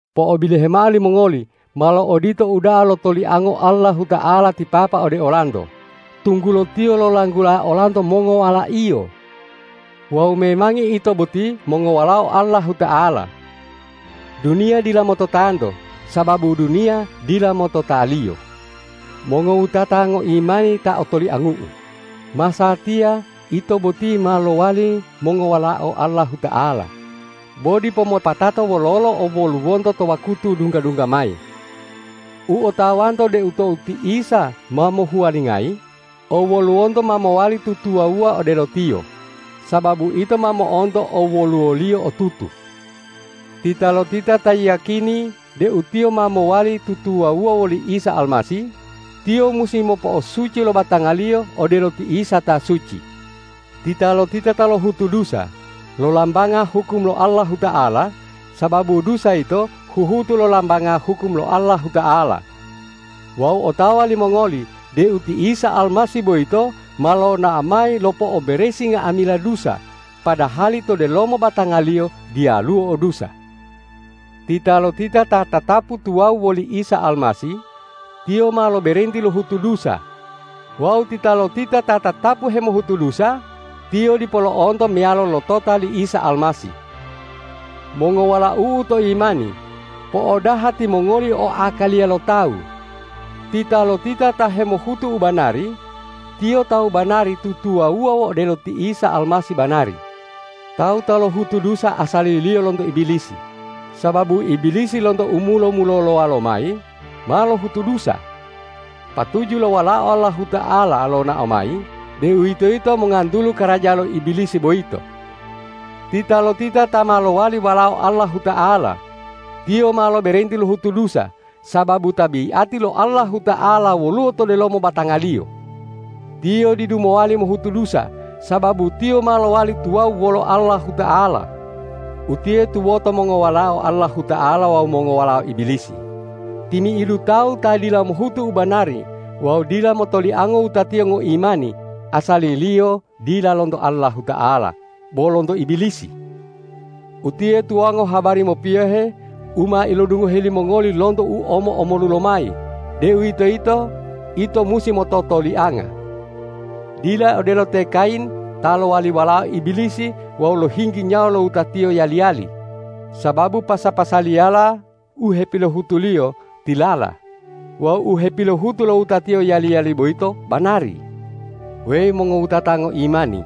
Po'obilohe mao limongoli, malo odito uda'a lo toliango Allahuta'ala ti Papa ode olanto, tunggulo Tiyo lolanggula olanto mongowala-Iyo. Wawu memangi ito boti mongowalao Allahuta'ala. Duniya dila mototanto sababu duniya dila motota-Liyo. Mongowutata ngoimani ta otoliangu'u, masatiya ito boti ma lowali mongowalao Allahuta'ala, bo dipo mopatato wololo owoluwonto to wakutu dungga-dungga mayi. U otawanto deu tou ti Isa ma mohuwalingayi, owoluwonto ma mowali tutuwawuwa odelo Tiyo, sababu ito ma mo'onto owoluwo-Liyo otutu. Titalotita ta yiyakini deu tiyo ma mowali tutuwawuwa woli Isa Almasih, tiyo musi mopo'osuci lo batangaliyo odelo ti Isa ta suci. Titalotita ta lohutu dusa, lolambanga hukum lo Allahuta'ala, sababu dusa yito huhutu lolambanga hukum lo Allahuta'ala. Wawu otawa limongoli deu ti Isa Almasih boyito ma lonao mayi lopo'oberesi nga'amila dusa, padahali to delomo batanga-Liyo diyaluwo o dusa. Titalotita ta tatapu tuwawu woli Isa Almasih, tiyo ma loberenti lohutu dusa; wawu titalotita ta tatapu hemohutu dusa, tiyo dipo lo'onto meyalo lotota li Isa Almasih. Mongowalau'u to imani, po'odaha timongoli o akaliya lo tawu. Titalotita ta hemohutu u banari, tiyo tawu banari tutuwawuwa odelo ti Isa Almasih banari. Tawu ta lohutu dusa asaliliyo lonto Ibilisi, sababu Ibilisi lonto u mulo-mulolowa lomayi ma lohutu dusa. Patuju lo Walao Allahuta'ala lonao mayi, deuwitoyito mongantulu karaja lo Ibilisi boyito. Titalotita ta ma lowali walao Allahuta'ala, tiyo ma loberenti lohutu dusa, sababu tabiati lo Allahuta'ala woluwo to delomo batangaliyo. Tiyo didu mowali mohutu dusa, sababu tiyo ma lowali tuwawu wolo Allahuta'ala. Utiye tuwoto mongowalao Allahuta'ala wawu mongowalao Ibilisi: Timi'idu tawu ta dila mohutu u banari wawu dila motoliango wutatiyo ngoimani asaliliyo dila lonto Allahuta'ala, bo lonto Ibilisi. Utiye tuwango habari mopiyohe u ma ilodungohe limongoli lonto u omo-omolu lomayi, deuwitoyito ito musi mototolianga. Dila odelo te Kayin ta lowali walao Ibilisi wawu lohinggi nyawa lo wutatiyo yali-yali, sababu pasa-pasaliyala u hepilohutuliyo tilala wawu u hepilohutu lo wutatiyo yali-yali boyito banari. Weyi mongowutata ngoimani,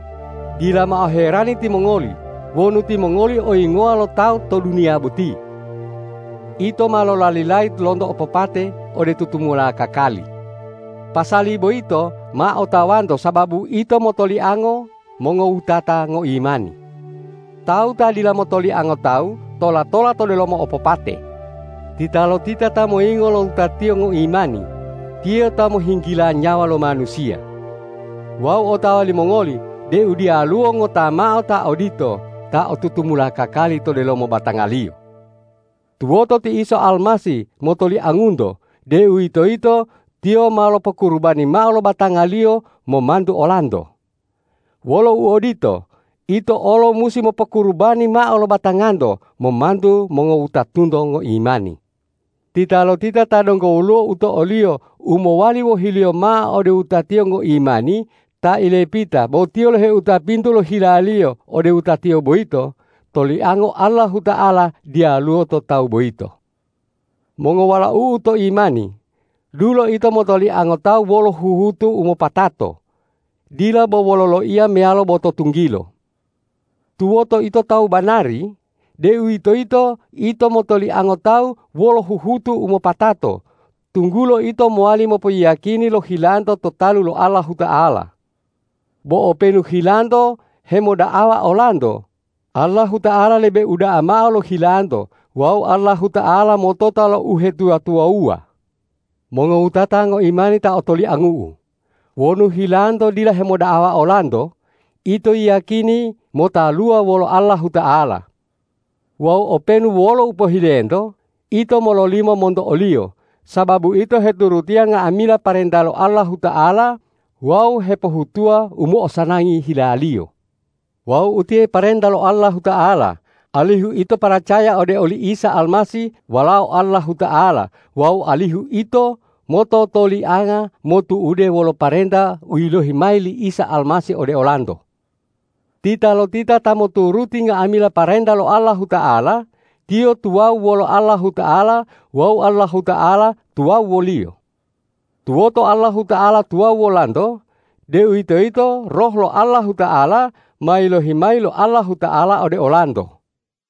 dila mao herani timongoli wonu timongoli oyingowa lo tawu to duniya boti. Ito ma lolalilayi lonto opopate ode tutumula kakali. Pasali boyito ma otawanto sababu ito motoliango mongowutata ngoimani. Tawu ta dila motoliango tawu tola-tola to delomo opopate. Titalotita ta moyingo lo wutatiyo ngoimani, tiyo ta mohinggila nyawa lo manusiya. Wawu otawa limongoli deu diyaluwo ngota mao ta odito ta o tutumula kakali to delomo batangaliyo. Tuwoto ti Isa Almasih motoliangunto, deuwitoyito Tiyo ma lopokurubani mao lo batanga-Liyo momantu olanto. Wolo uodito, ito olo musi mopokurubani mao lo batanganto momantu mongowutatunto ngoimani. Titalotita ta donggo woluwo u to'oliyo u mowali wohiliyo mao ode wutatiyo ngoimani ta ilepita bo tiyo loheuta pintu lo hilaliyo ode wutatiyo boyito, toliango Allahuta'ala diyaluwo to tawu boyito. Mongowalau'u to imani, dulo ito motoliango tawu wolo huhutu u mopatato, dila bo wolo loiya meyalo bo to tunggilo. Tuwoto ito tawu banari, deuwitoyito ito motoliango tawu wolo huhutu u mopatato, tunggulo ito mowali mopoyiyakini lo hilanto to talu lo Allahuta'ala. Bo openu hilanto hemoda'awa olanto, Allahuta'ala lebe uda'a mao lo hilanto wawu Allahuta'ala motota lo uhetuwa-tuwawuwa. Mongowutata ngoimani ta otoliangu'u, wonu hilanto dila hemoda'awa olanto, ito yiyakini motaluwa wolo Allahuta'ala. Wawu openu wolo u pohilento, ito mololimo monto o-Liyo, sababu ito heturutiya nga'amila parenta lo Allahuta'ala wawu hepohutuwa u mo'osanangi hila-Liyo. Wawu utiye parenta lo Allahuta'ala, alihu ito paracaya ode oli Isa Almasih Walao Allahuta'ala wawu alihu ito mototolianga motu'ude wolo parenta u yilohi mayi li Isa Almasih ode olanto. Titalotita ta moturuti nga'amila parenta lo Allahuta'ala, tiyo tuwawu wolo Allahuta'ala wawu Allahuta'ala tuwawu woliyo. Tuwoto Allahuta'ala tuwawu wolanto, deuwitoyito Roh lo Allahuta'ala ma yilohi mayi lo Allahuta'ala ode olanto.